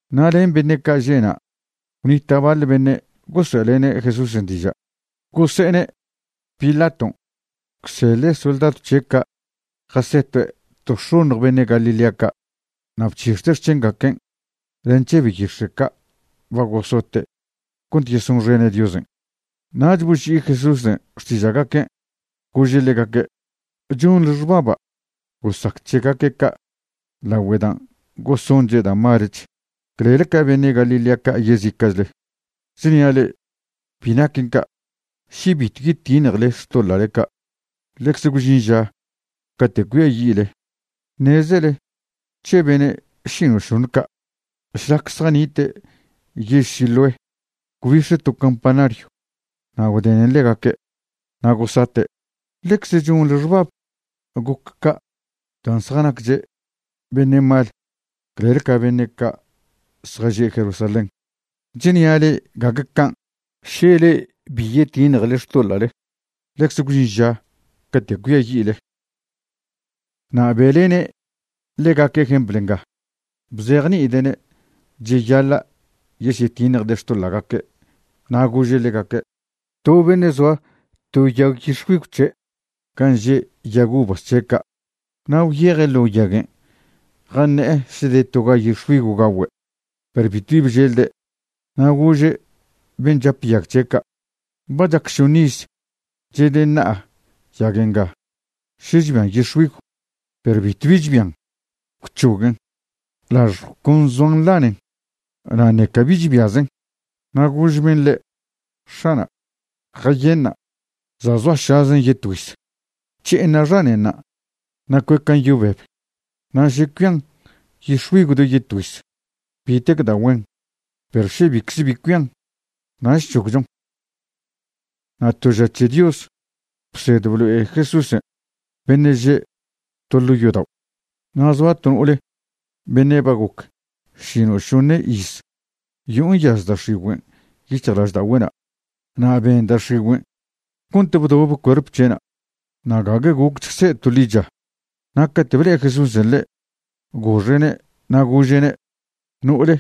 Na' len beṉe' ca' že'na' gwnita' baḻ beṉe' gosoe'lene' Jesúsen' diža', gose'ene' Pilaton' gwseḻe' soldadw c̱he' ca' jasetue' to x̱oṉj beṉe' Galilea ca' na' bc̱hix̱de' xc̱hengaquen' len c̱he beyix̱e' ca' ba gosote' cont yesonxene' Diosen'. Nach boži'i Jesúsen' xtiža'gaquen' gože' ḻegaque': ―¿Chonḻe xbaba' gosac c̱hegaque' ca' lagüe dan' gosonche' da' malech clel ca beṉe' Galilea ca' yezica'chle? Chnia' le'e, bi naquen ca'. Še bitw yetiṉjele xtoḻa'le ca', ḻecze gwžin ža cate' cuiayi'le. Ṉezele c̱he beṉe' šino'šoṉe ca', šlac zjanite' yež Siloé gwbix̱e to campanaryw na' gwdenen ḻegaque' na' gosate'. ¿Ḻecze chonḻe xbab goc ca' dan' zjanacche' beṉe' mal clel ca beṉe' ca' zjaže' Jerusalén? Chnia' le'e, gague can'. Še le'e bi yetiṉjele xtoḻa'le, ḻecze gwžin ža cate' cuiayi'le. Na' be'lene' ḻegaque' jempl nga, bzejni'ide'ne' cheyaḻa' yesyetiṉjde' xtoḻa'gaque', na' gože' ḻegaque': ―To beṉe' zoa to yag yix̱güigw c̱he' gan' že' yag uvas c̱he' ca'. Na' gwyeje' ḻo' yaguen' jaṉe'e še de toga yix̱güigw gagüe', perw bitw bi bželde'. Na' gože' ben' chape' yag c̱he' ca': “Ba chac šoṉ iz chedeṉa'a yag nga še chbian yix̱güigw, perw bitw bi chbian. Gwc̱hoguen, lažjw con zoan nḻanen, na' ṉeca bi chbiazen.” Na' gož ben' ḻe': “X̱ana', jayenṉa', za' zoašazen yetgüiz, c̱he'eṉa' xanenṉa' na' cuecan' yo beb. Na' še cuian yix̱güigw do yetgüiz, bitec da' güen, perw še bicze bi cuian, nach c̱hogchon.” Na' to ža c̱he Dios bsed blo'e Jesúsen' beṉe' že' to ḻo' yodao'. Na' zoa to no'ole beṉe' ba goc šino'šoṉe iz yo'o nyaz da' x̱igüen' yic̱hjlažda'ogüe'na'. Na' ben da' x̱igüen' cont bdobe cuerp c̱he'na', na' gague gocch se' to ḻicha. Na' cate' ble'e Jesúsen' ḻe', goxe'ne' na' gože'ne': ―No'ole,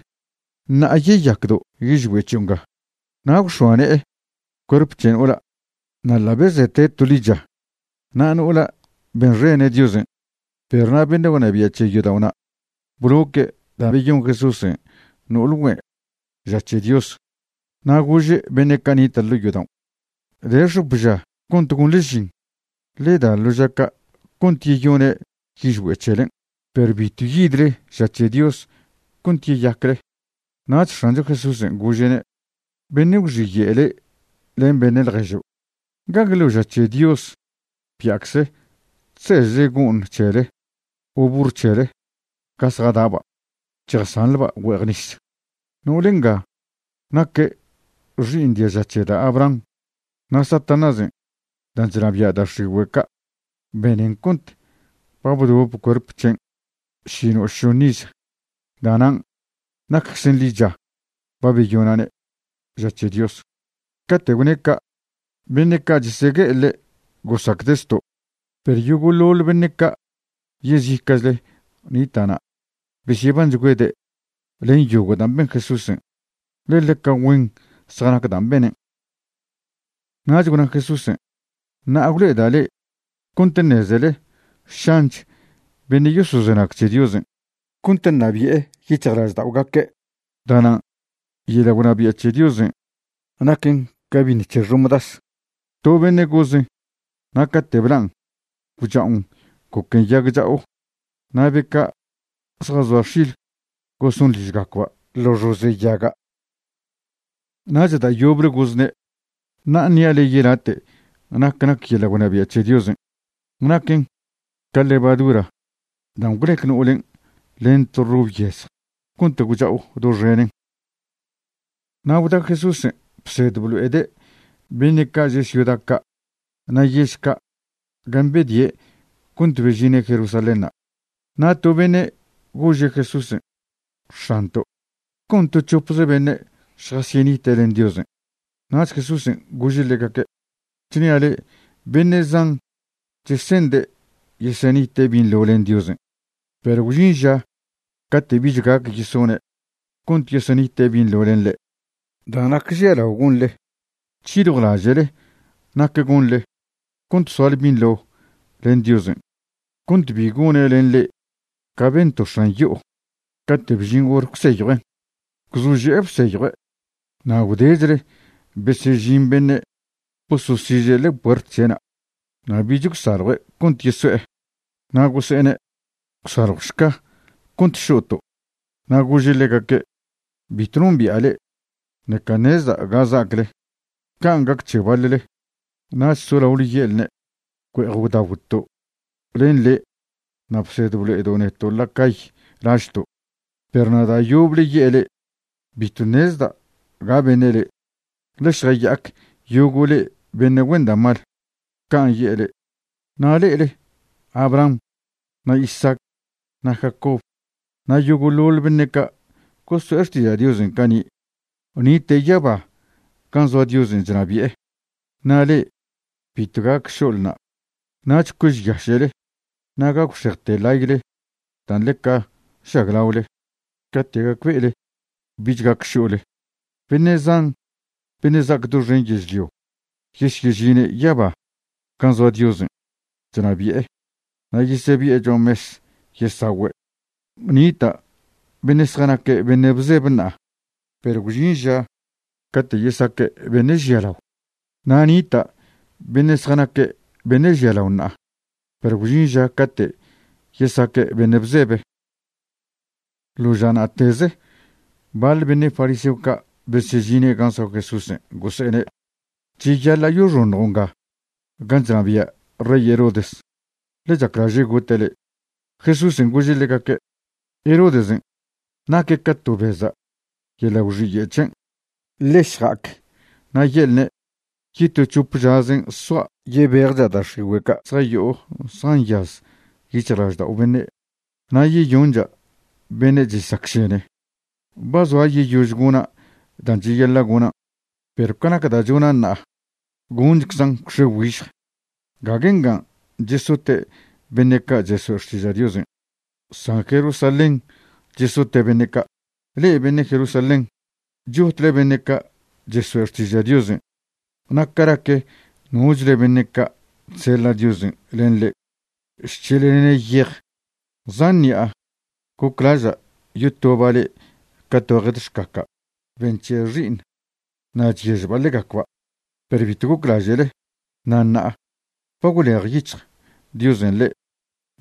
ṉa'a yeyacdo' yižgüe' c̱hio' nga. Na' gwx̱oa ne'e cuerp c̱he no'ola', na' ḻa' bezete' to ḻicha. Na' no'ola' benxene' Diosen'. Perw na' beṉe' gwnabia' c̱he yodao'na' bloque' da' beyon Jesúsen' no'ole güen' ža c̱he Dios. Na' gože' beṉe' ca' nita' ḻo' yodaon': ―De x̱op ža cont gonḻe žin. Ḻe da ḻo ža ca' cont yeyone' yižgüe' c̱helen' perw bitw yidle ža c̱he Dios cont yeyacle. Nach X̱ancho Jesúsen' gože'ne': ―Beṉe' gwxiye' le' len beṉe' ḻježo'. ¿Gague ḻo ža c̱he Dios bia'cze chsežle go'ṉ c̱hele o burr c̱hele ga zjada'ba' chjasanḻba' güe'ej nis? No'ole nga naque' xi'iṉ diaža c̱he da' Abraham, na' Satanásen' dan' chnabia' da' x̱igüe' ca' benen cont ba bdobe cuerp c̱hen' šino'šoṉe iz. Da'nan' nacczen ḻicha ba beyona'ne' ža c̱he Dios. Cate' gwne' ca', beṉe' ca' chesegue'e ḻe' gosacde' zto', perw yogo'ḻoḻ beṉe' ca' yezica'chle nita'na' besyebanchgüede' len yogo' dan' ben Jesúsen', ḻe ḻeca güen zjanac dan' benen'. Nach gwna Jesúsen': ―Ṉa'a gwlo'eda' le'e cont ṉezele šanch beṉe' yosozenag c̱he Diosen' cont ṉabi'e yic̱hjlažda'ogaque'. Da'nan' yeḻa' gwnabia' c̱he Diosen' naquen ca biṉ c̱he xomdas. To beṉe' gozen' na' cate' blan' gwcha'on goquen yag cha'o na' be ca' zjazoa x̱il goson ližgacba' ḻo xoze' yaga'. Nach da' yoble gozne': ―Ṉa'a ṉia' le'e yelate' nac nac yeḻa' gwnabia' c̱he Diosen'. Naquen ca levadura dan' gwlec no'olen' len to rob yezj cont gwcha'o doxenen. Na' gwda Jesúsen' bsed blo'ede' beṉe' ca' že' ciuda ca' na' yež ca' gan' bedie' cont bežine' Jerusalénṉa'. Na' to beṉe' gože' Jesúsen': ―X̱anto', ¿con to c̱hopze beṉe' šjasyenite' len Diosen'? Nach Jesúsen' gože' ḻegaque': ―Chnia' le'e, beṉe' zan chese'nde' yeseṉite' binḻo len Diosen', perw gwžin ža cate' bich gac yesone' cont yeseṉite' binḻo len ḻe'. Da' nac žialao gonḻe, c̱hiljwlaže'le nac gonḻe cont soale binḻo len Diosen' cont bi gone' len le'e ca ben to x̱an yo'o cate' bžin hor gwseyjuen'. Gwzože'e bseyjue', na' gwdechle besežin beṉe' bososiže' ḻe'e puert c̱he'na' na' bich gwsaljue' cont yeso'e. Na' gose'ene': “Gwsaljwšca cont šo'to'.” Na' gože' ḻegaque': “Bitw nombi'a le'e, ṉeca ṉezda' ga za'acle.” Can' gac c̱he baḻle. Nach solaole ye'lne': “Güe'ej gwdagwto' len le' na' bsed blo'edo' neto' la cay lažto'.” Perw na' da' yoble ye'e le'e: “Bitw ṉezda' ga beṉe' le'e. Ḻe šjaya'ac yogo' le'e beṉe' güen da' mal.” Can' ye'e le'e. Na' le'ele Abraham na' Isaac na' Jacob na' yogo'ḻoḻ beṉe' ca' gosoe' xtiža' Diosen' cani' nite' yaba gan' zoa Diosen' chnabi'e. Na' le'e bitw gac šo'lena'. Nach cuežyaše'le na' gagwxejte ḻayle dan' ḻeca žaglaole cate' gacbe'ele bich gac šo'le. Beṉe' zan beṉe' za'ac doxen yežlio yesyežine' yaba gan' zoa Diosen' chnabi'e na' yesebi'e cho'a mes yesagüe'. Nita' beṉe' zjanaque' beṉe' bzebe ṉa'a perw gwžin ža cate' yesaque' beṉe' žialao. Na' nita' beṉe' zjanaque' beṉe' žialao ṉa'a, perw gwžin ža cate' yesaque' beṉe' bzebe. Ḻo ža na'teze baḻ beṉe' fariseo ca' besežine' gan' zoa Jesúsen' gose'ene': ―Cheyaḻa' yoxoṉjo' nga gan' chnabia' rey Herodes, ḻe chaclaže' gote' le'. Jesúsen' gože' ḻegaque': ―Herodesen' naque' ca to beza' yeḻa' gwxiye' c̱hen'. Ḻe šja'ac na' ye'lne' yeto c̱hope žazen' soa' yebejcha' da' x̱igüe' ca' zjayo'o zjanyaz yic̱hjlaždao' beṉe' na' yeyoncha' beṉe' chesacšene. Ba zoa yeyož gona' dan' cheyaḻa' gonan'. Perw ca nac dan' chona' ṉa'a gonchczan' gwx̱e güižj. Gague ngan' chesote' beṉe' ca' chesoe' xtiža' Diosen', san Jerusalén chesote' beṉe' ca'. ’Le'e beṉe' Jerusalén, chotle beṉe' ca' chesoe' xtiža' Diosen' na' ca nac nochle beṉe' ca' chseḻa' Diosen' len le'e, chc̱heḻlene' yej. Zan ṉi'a goclaža' yotoba' le'e ca to jed xcaca' be nc̱he' xi'iṉ na' chyežba' ḻegacba', perw bitw goclaže'le. Na' ṉa'a ba gwlejyic̱hj Diosen' le'e.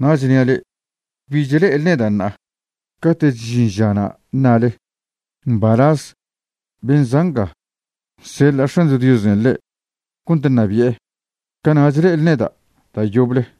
Na' chnia' le'e, bich le'ele neda' ṉa'a. Cate'ch žin žana' ṉale: “Mbalaz ben' za' nga nseḻa' X̱ancho Diosen' ḻe' cont ṉabi'e”, cana'ch le'ele neda' da' yoble.